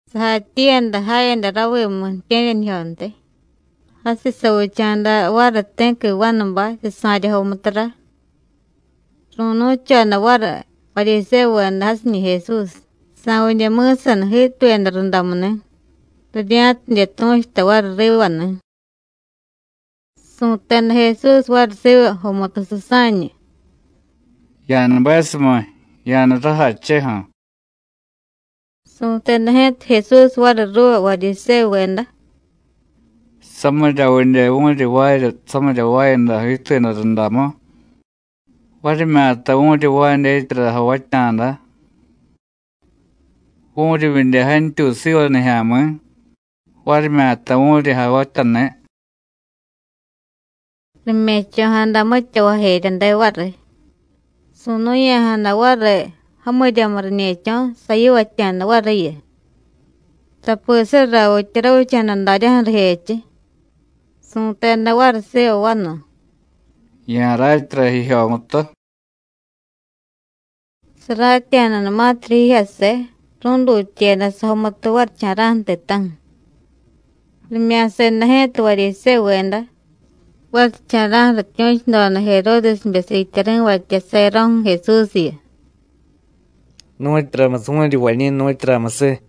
Sajatyiiyada jayada ravimu ju̱tye̱ryanijyontiy. Jasiy savicha̱da variy ti̱qui vanubay, susa̱rya jomutura. Ru̱nu̱choda variy Varyisévuveda jasiñi̱ Jesús, sa̱vidye mi̱saniy jiituyada rundamuni̱, rirya̱tidye tu̱chuta variy riva ni̱. Su̱teda Jesús variy siva jomutu susa̱ñu: “Ya̱nubesumiy, ya̱jniy rajacheju̱.” Su̱teda ji̱ta Jesús variy ruuva Varyisévuveda: “¿Samiryavidye vu̱ryi jvaarya samirya jvaayada jiituyada rundamu, varimyata vu̱ryi jvaay dyetyara javatya̱da? ¿Vu̱ryivyidye jantyuy siva nijya̱mi̱, varimyata vu̱ryi javatyani̱?” Rime̱cho̱jada mitya vajeryade variy. Su̱nu̱ya̱jada variy jamiryamu riñe̱cho̱, sayivatya̱da variyu, tapi surravitya ravicha̱da daryaju̱ rijechiy. Su̱teda variy siva vanu: “Ya̱ratyara jijyomutu.” Saratya̱danumatirya jijyase, ru̱dutyeda sajomutu varicha̱ra̱ju̱ ti̱ta̱ju̱. Rimya̱seda ji̱ta Varyisévuveda, varicha̱ra̱ju̱ rityu̱chudoda Jeródesbe siityari̱vatya sayaro̱ju̱ Jesúsyu: “¿Nu̱tyuramusiy vu̱ryi jvañi̱, nu̱tyuramusiy?”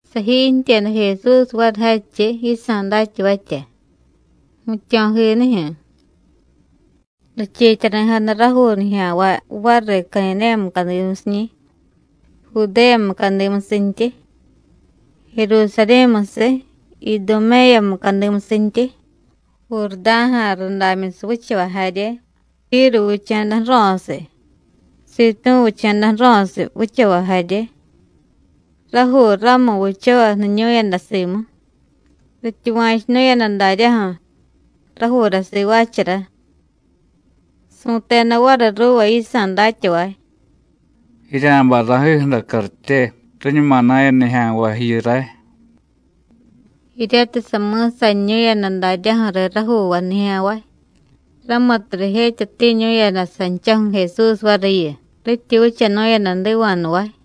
Sajiintyeda Jesús variy jadchiy yisa̱ datyavatya, jmityo̱jinijyu̱. Richiityari̱jada rajuu nijya̱nvay variy Cadidéya mucadimusiñi̱, Judéya mucadimusintyi. Jerusarí̱musiy, Iduméya mucadimusintyi, Jurdá̱ja̱ rudamyusiy vichavay jarye, Tíru vicha̱da ju̱ro̱siy, Sitú̱ vicha̱da ju̱ro̱siy vichavay jarye, rajuu ramu vichavay jniñu̱yada simu, rityuva̱chunu̱yada daryaju̱: Rajuura sivaachara. Su̱teda variy ruuva yisa̱ datyavay: “Jirya̱bay ra̱jiju̱ra cartye, riñuma na̱ya nijya̱nvay jiyu ray.” Jiryatiy sami̱saniñu̱yada daryaju̱riy rajuuvay nijya̱nvay, ramutiy rijetyatiñu̱yada sanchaju̱ Jesús variyu, rityi vichanu̱yada jdiva̱jnuvay.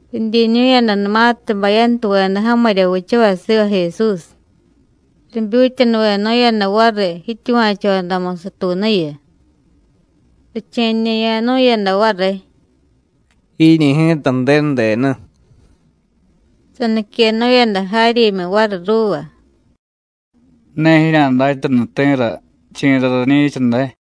Ridyiñu̱yadanumatiy bayantuveda jamirya vichavay siva Jesús, ribyutyanuvenu̱yada variy jityuva̱chodamu satuunuyu, riche̱ñe̱ya̱nu̱yada variy: “Jiiñi̱ ji̱ta Ju̱denu denu.” Saniquenu̱yada jaryimyu variy ruuva: “Ne jirya̱datyanu ti̱ra chi̱ra rañi̱cha day.”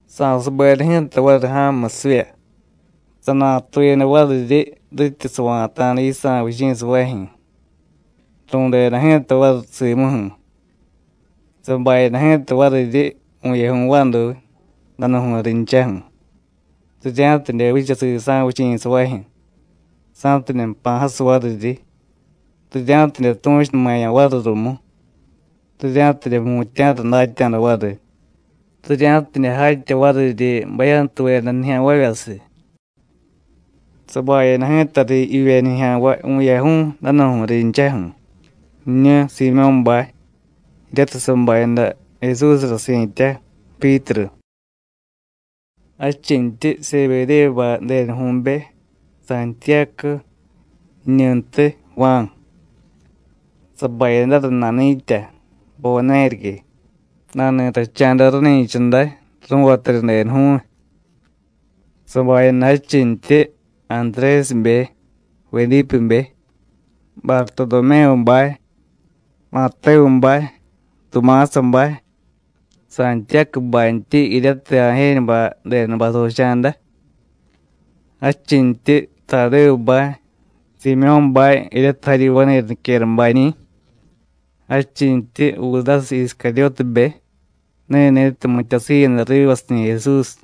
Sa̱subeda ji̱ta variy ja̱mumusivya, sanatuyada variryi rityi sava̱ta̱da yisa̱ vichi̱savajyu̱. Ru̱deda ji̱ta variy simuju̱. Sabayada ji̱ta variryi vu̱yaju̱y vaduy, danu̱ju̱y rinchaju̱, rirya̱tidye vicha sisa̱ vichi̱savajyu̱, sa̱tidye jpa̱ jasiy variryi, rirya̱tidye tu̱chunumaya̱ variy rumu, rirya̱tidye jmutya̱ra datya̱da variy, rirya̱tidye jatya variryi bayantuveda nijya̱nvavyasiy. Sabayada ji̱tariy jivye nijya̱nvay vu̱yaju̱y, danu̱ju̱y rinchaju̱: jiñu Siimyó̱bay, jiryatiy sabayada Jesúsra si̱tya Pyítru. Jadchintyi Sebedévubay denuju̱be Santiyácu, jiñuntiy Juán. Sabayadara nani̱tya Buvanérique, nani̱tacha̱da ráni̱cha day ru̱vatarya denuju̱y. Sabayada jadchintyi Antrésibe, Vedípebe, Bartodomévubay, Matévubay, Tumásabay, Santiyácubantyi jiryatiy Ajéñubay denubay savicha̱da. Jadchintyi Tadévubay, Siimyó̱bay jiryatiy jaryi vani̱ra niquerabañi̱, jadchintyi, Judásiy Iscaryótibe ni̱ni̱tiy mityasiiyada rivasiñi̱ Jesús.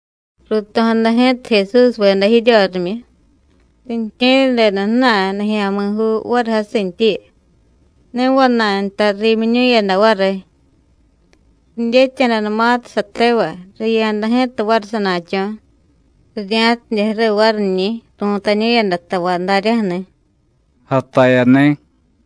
Ruuto̱jada ji̱ta Jesúsveda jiryorimyu, riintye̱ryadeda ju̱na̱y nijya̱mi̱juu variy jasintyiyu, ne vana̱y nta riimyiñu̱yada variy. Ridyetya̱danumatiy satevay, riya̱da ji̱ta variy sana̱cho̱, rirya̱tidye ju̱riy variñi̱, ru̱tañu̱yada tavay daryaju̱ni̱: “Jatayani̱.”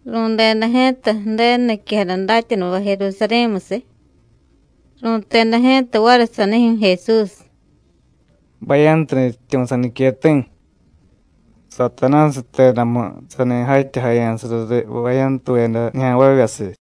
Ru̱deda ji̱ta Ju̱denu niquejada datyanuvay Jerusarí̱musiy, ru̱teda ji̱ta variy sanijyu̱ Jesús: “Bayantu nutyityu̱ saniqueti̱. Satanásiy jtedamu sani jatyajaya̱sara riy bayantuveda nijya̱nvavyasiy.”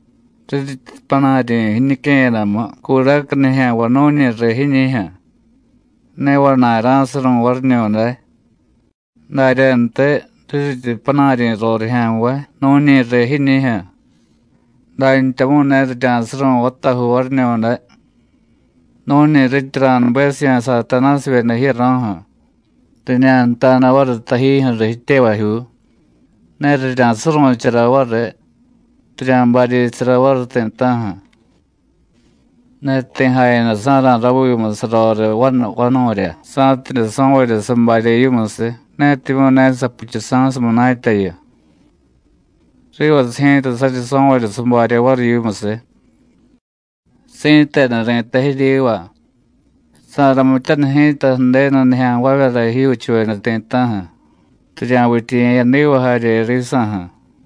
Riryityi panaryi̱ jiñique̱yadamu curaca nijya̱nvay nu̱ñi riy jiñi̱jyu̱, ne vana̱y rá̱suru̱y variñu̱day. Daryantiy, riryityi panaryi̱ rorijya̱nvay nu̱ñi riy jiñi̱jyu̱, dantyamu̱y ne rirya̱suru̱y vatajuu variñu̱day. Nu̱ñi rityi ra̱nubesiya̱ Satanásivyeda jiyaro̱ju̱, riñanta̱da variy tajijyu̱riy jityevajyuu, ne rirya̱suru̱chara variy, rirya̱baryi̱sara variy ti̱ta̱ju̱. Ne ti̱ jayadasa̱ra̱ ravimu saroriy vanu vanu̱rya, sa̱tidye so̱varya sabarya yimusiy, netimyu̱ ne sapuchusa̱siy munatyayu. Rivasiy ji̱ta saryi so̱varya sabarya variy yimusiy. Si̱tenu ri̱tay jiryiva: Sa̱ramityaniy ji̱ta Ju̱denu nijya̱nvavyara jijyuuchuveda ti̱ta̱ju̱, rirya̱vityiye̱yadiva jarye risa̱ju̱.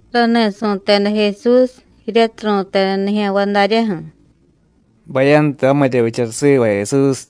Rani̱ su̱teda Jesús, jiryatiy ru̱teda nijya̱nvay daryaju̱: “Bayantu jamirya vichara siva Jesús.”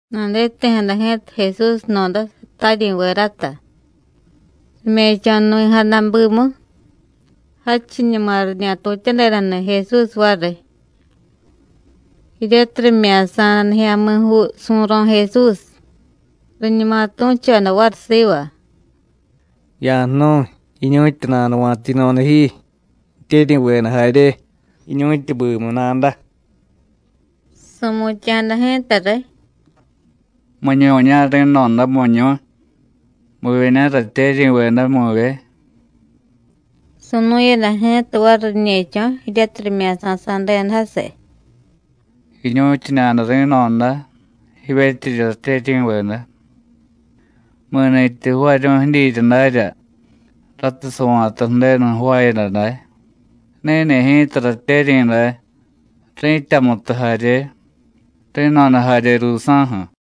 Naditi̱jada ji̱ta Jesús jno̱da sataryi̱vedata, rime̱cho̱nuvi̱jada bimu, jadchiñuma riñatutyadedani̱ Jesús variy. Jiryatiy rimya̱sa̱da nijya̱mi̱juu su̱ro̱ Jesús, riñuma tu̱choda variy siva: “Ya̱jnu̱y, jiñu̱tyi nanuva̱ta yino̱da ji, jityeryi̱veda jarye, jiñu̱tyi bimu nada.” Su̱mutya̱jada ji̱ta riy: “¿Miñu̱ña̱ ri̱no̱da, miñu̱y? ¿Muvyeña̱ ratyeryi̱veda, muvye?” Su̱nu̱yada ji̱ta variy riñe̱cho̱ jiryatiy rimya̱sasa̱deda jasiy: “Jiñu̱tyiñada ri̱no̱da, jivyetyiryi ratyeryi̱veda. Mi̱ni̱tyi jvaaryu̱y jidyirya darya ratiy sava̱ta Ju̱denu jvaayada day, ni̱ni̱ ji̱ta ratyeryi̱ day, ri̱tyamutu jarye, ri̱no̱da jarye ruusa̱ju̱.”